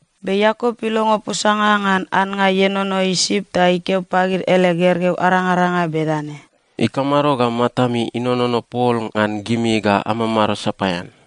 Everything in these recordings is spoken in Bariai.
Be Iakop ilongo posanga ngan annga ienono Isip ta ikeo pagid ele gergeu arangaranga bedane, “Ikamado ga matami inonono pol ngan gimi ga amamado sapaean?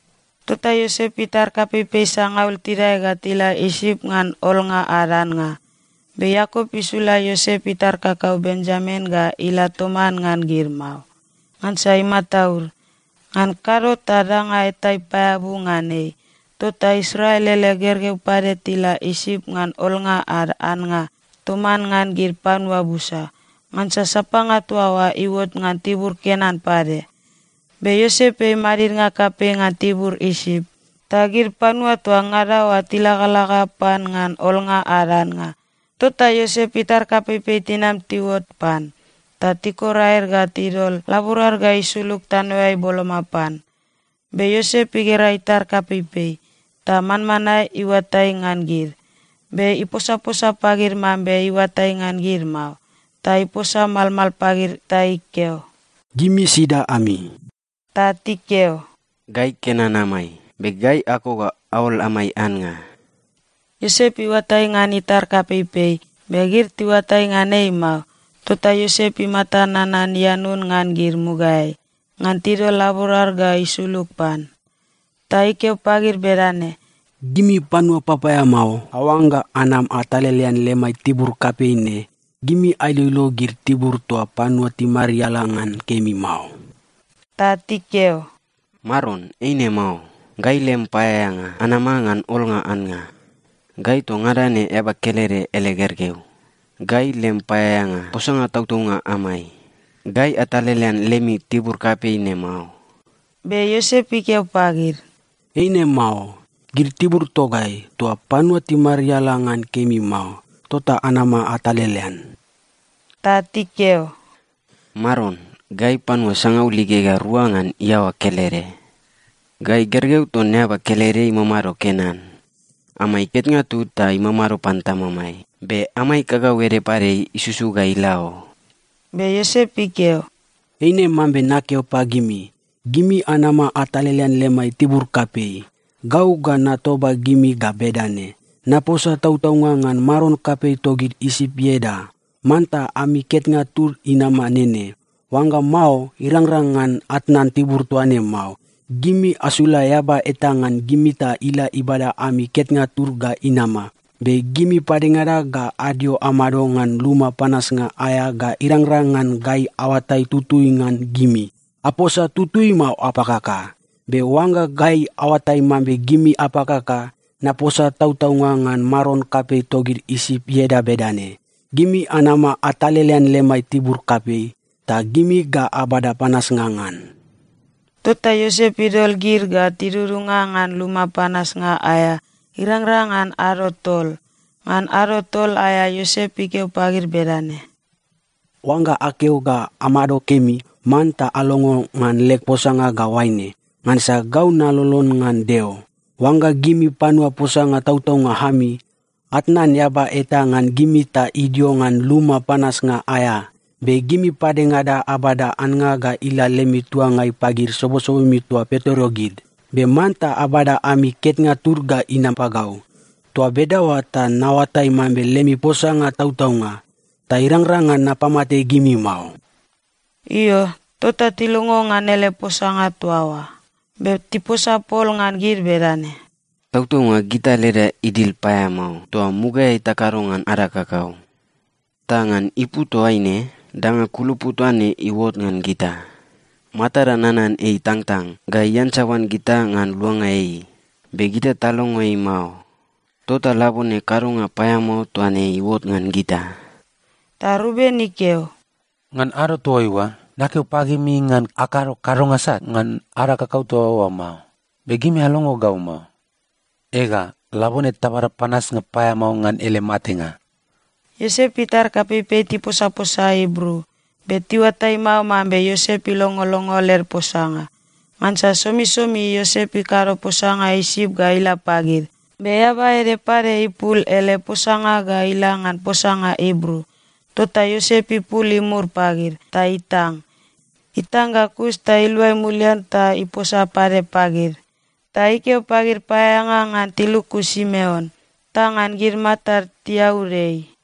Tota Iosep itar kapeipei sangaul tidae ga tila Isip ngan olnga ad annga. Be Iakop isula Iosep itar kakau Benjamin ga ila toman ngan gid mao, ngansa imataud. Ngan kado ta danga eta ipaeabu ngan ei. Tota Israel ele gergeu pade tila Isip ngan olnga ad annga toman ngan gid panua busa, ngansa sapanga toa oa iuot ngan tibur Kenan pade. Be Iosep ei madidnga kapei ngan tibur Isip, ta gid panua toa ngada oa tilagalaga pan ngan olnga ad annga. Tota Iosep itar kapeipei tinam tiuot pan, ta tikor aed ga tidol laborad ga isulug tanoeai boloma pan. Be Iosep igera itar kapeipei, ta manmanae iuatai ngan gid. Be iposaposa pagid mambe iuatai ngan gid mao. Ta iposa malmal pagid ta ikeo, “Gimi sida ami?” Ta tikeo, “Gai Kenan amai. Be gai akeo ga aol amai annga.” Iosep iuatai ngan itar kapeipei, be gid tiuatai ngan ei mao. Tota Iosep imata nanan ianun ngan gid mugaeai, ngan tidol laborad ga isulug pan. Ta ikeo pagid bedane, “Gimi panua papaeamao, aoangga anama atalelean lemai tibur kapei ne. Gimi ailoilo gid tibur toa panua timariala ngan kemi mao.” Ta tikeo, “Maron, eine mao. Gai lem paeaeanga, anama ngan olnga annga. Gai toa ngada ne eaba kelede ele gergeu. Gai lem paeaeanga, posanga tautaunga amai. Gai atalelean lemi tibur kapei ne mao.” Be Iosep ikeo pagid, “Eine mao. Gid tibur togai, toa panua timariala ngan kemi mao, tota anama atalelean.” Ta tikeo, “Maron, gai panua sangaul igegea rua ngan iaoa kelede. Gai gergeu ton eaba kelede imamado Kenan. Amai ketnga tud ta imamado pan tamamai, be amai kakau ede pade isusu ga ila o.” Be Iosep ikeo, “Eine mambe nakeo pagimi, gimi anama atalelean lemai tibur kapei! Gau ga natoba gimi ga bedane: Naposa tautaunga ngan maron kapei togid Isip ieda, manta ami ketnga tud inama nene. Oangga mao, irangrang ngan atnan tibur toa ne mao. Gimi asula eaba eta ngan gimi ta ila ibada ami ketnga tud ga inama. Be gimi padengada ga adio amado ngan luma panasnga aea ga irangrang ngan gai aoatai tutui ngan gimi: aposa tutui, mao apakaka. Be oangga gai aoatai mambe gimi apakaka, naposa tautaunga ngan maron kapei togid Isip ieda bedane: Gimi anama atalelean lemai tibur kapei, ta gimi ga abada panasnga ngan.” Tota Iosep idol gid ga tidudunga ngan luma panasnga aea, irangrang ngan ado tol. Ngan ado tol aea Iosep ikeo pagid bedane, “Oangga akeo ga amado kemi, manta alongo ngan leg posanga ga oaine. Ngansa gau nalolon ngan Deo. Oangga gimi panua posanga tautaunga ami, atnan eaba eta ngan gimi ta idio ngan luma panasnga aea, be gimi padengada abada annga ga ila lemi tuangai pagid sobosobomi toa pitoreagid. Be manta abada ami ketnga tud ga inam pagau. Toa bedaoa ta naoatai mambe lemi posanga tautaunga, ta irangrang ngan napamate gimi mao.” Io, tota tilongo ngan ele posanga toa oa. Be tiposa pol ngan gid bedane, “Tautaunga, gita leda idil paeamao toa mugaeai takado ngan ada kakau, ta ngan ipu toaine danga kulupu toa ne iuot ngan gita. Matada nanan ei itangtang ga iansaban gita ngan luanga ei, be gita talongo ei mao. Tota labone kadonga paeamao toa ne iuot ngan gita.” Ta Ruben ikeo, “Ngan ado toaiua, nakeo pagimi ngan akado kadonga sat ngan ada kakau toa oa mao, be gimi alongo gau mao. Ega, labone tabada panasnga paeamao ngan ele matenga.” Iosep itar kapeipei tiposaposa Ibru, be tiuatai mao mambe Iosep ilongolongo led posanga. Ngansa somisomi Iosep ikado posanga Isip ga ila pagid, be eaba ede pade ipul ele posanga ga ila ngan posanga Ibru. Tota Iosep ipul imur pagid, ta itang. Itang ga kus ta iluai mulian ta iposa pade pagid. Ta ikeo pagid paeaeanga ngan tiluku Simeon, ta ngan gid matad tiaud ei.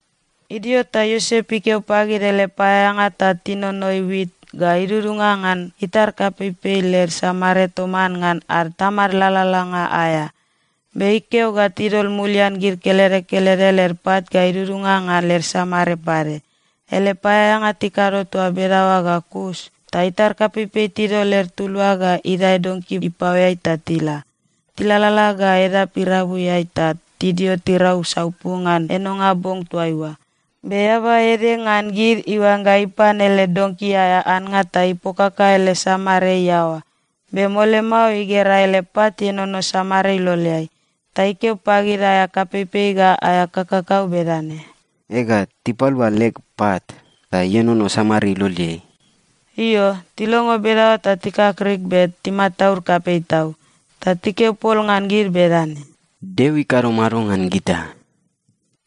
Idio ta Iosep ikeo pagid ele paeaeanga ta tinonoi wit ga idudunga ngan itar kapeipei led samare toman ngan ad tamad lalalanga aea. Be ikeo ga tidol mulian gid kelede kelede led pat ga idudunga ngan led samare pade. Ele paeaeanga tikado toa bedaoa ga kus ta itar kapeipei tidol led tulua ga idae donki ipaoeai ta tila. Tilalala ga edap irabuiai ta tidio tirau saupu ngan enonga bong toaiua. Be eaba ede ngan gid iuangga ipan ele donki aea annga ta ipokaka ele samare iaoa. Be mole mao igera ele pat ienono samare iloleai. Ta ikeo pagid aea kapeipei ga aea kakakau bedane, “Ega, tipalua leg pat! Ta ienono samare iloleai!” Io, tilongo bedaoa ta tikakrik be timataud kapei tau. Ta tikeo pol ngan gid bedane, “Deo ikado mado ngan gita?”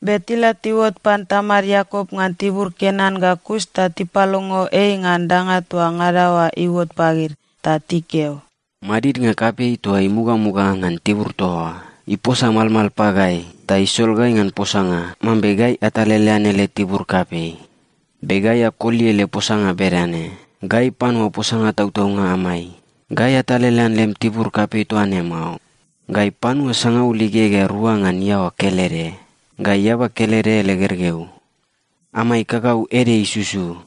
Be tila tiuot pan tamad Iakop ngan tibur Kenan ga kus ta tipalongo ei ngan danga toa ngada oa iuot pagid. Ta tikeo, “Madidnga kapei toa imugamuga ngan tibur toa oa, iposa malmal pagai ta isol gai ngan posanga mambe gai atalelean ele tibur kapei. Be gai akoli ele posanga bedane, ‘Gai panua posanga tautaunga amai. Gai atalelean lem tibur kapei toa ne mao. Gai panua sangaul igegea rua ngan iaoa kelede. Gai eaba kelede ele gergeu. Amai kakau ede isusu,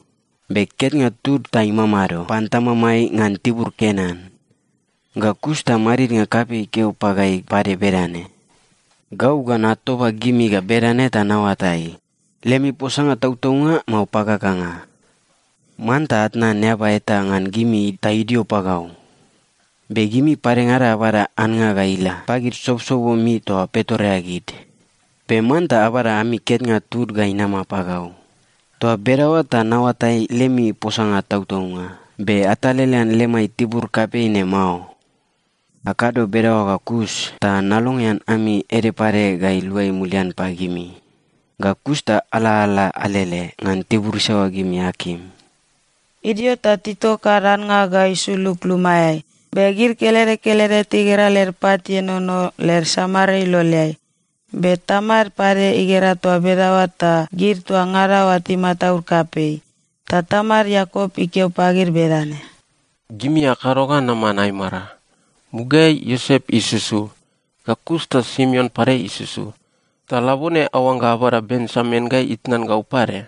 be ketnga tud ta imamado pan tamamai ngan tibur Kenan.’ “Ga kus ta madidnga kapei ikeo pagai pade bedane, ‘Gau ga natoba gimi ga bedane ta naoatai, lemi posanga tautaunga, mao pakakanga. Manta atnan eaba eta ngan gimi ta idio pagau. Be gimi padengada abada annga ga ila pagid sobosobomi toa pitoreagid. Be manta abada ami ketnga tud ga inam pagau. Toa bedaoa ta naoatai lemi posanga tautaunga, be atalelean lemai tibur kapei ne mao. Akado bedaoa ga kus ta nalongean ami ede pade ga iluai mulian pagimi. Ga kus ta alalala alele ngan tibur isaoa gimi akim.’” Idio ta titok ad annga ga isulug lumaeai, be gid kelede kelede tigera led pat ienono led samare iloleai! Be tamad pade igera toa bedaoa ta gid toa ngada oa timataud kapei. Ta tamad Iakop ikeo pagid bedane, “Gimi akado ga naman aimara. Mugaeai Iosep isusu, ga kus ta Simeon pade isusu. Ta labone aoangga abada Benjamin ga itnan gau pade?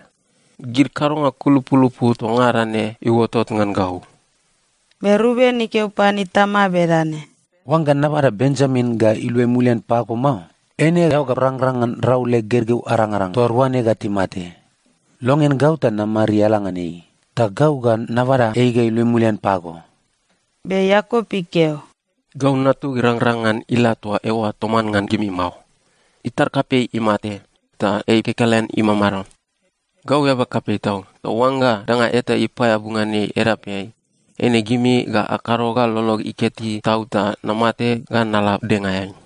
Gid kadonga kulupulupu toa ngada ne iuotot ngan gau!” Be Ruben ikeo pan itama bedane, “Oangga nabada Benjamin ga iluai mulian pago mao, eine eao ga rangrang ngan rau leg gergeu arangaranga toa rua ne ga timate. Longean gau ta namariala ngan ei, ta gau ga nabada ei ga iluai mulian pago.” Be Iakop ikeo, “Gau natug irangrang ngan ila toa eoa toman ngan gimi mao. Itar kapei imate, ta ei kekelen imamado. Gau eaba kapei tau, ta oangga danga eta ipaeabu ngan ei edapeai, eine gimi ga akado ga lolog iketi tau ta namate ga nala dengaeai.”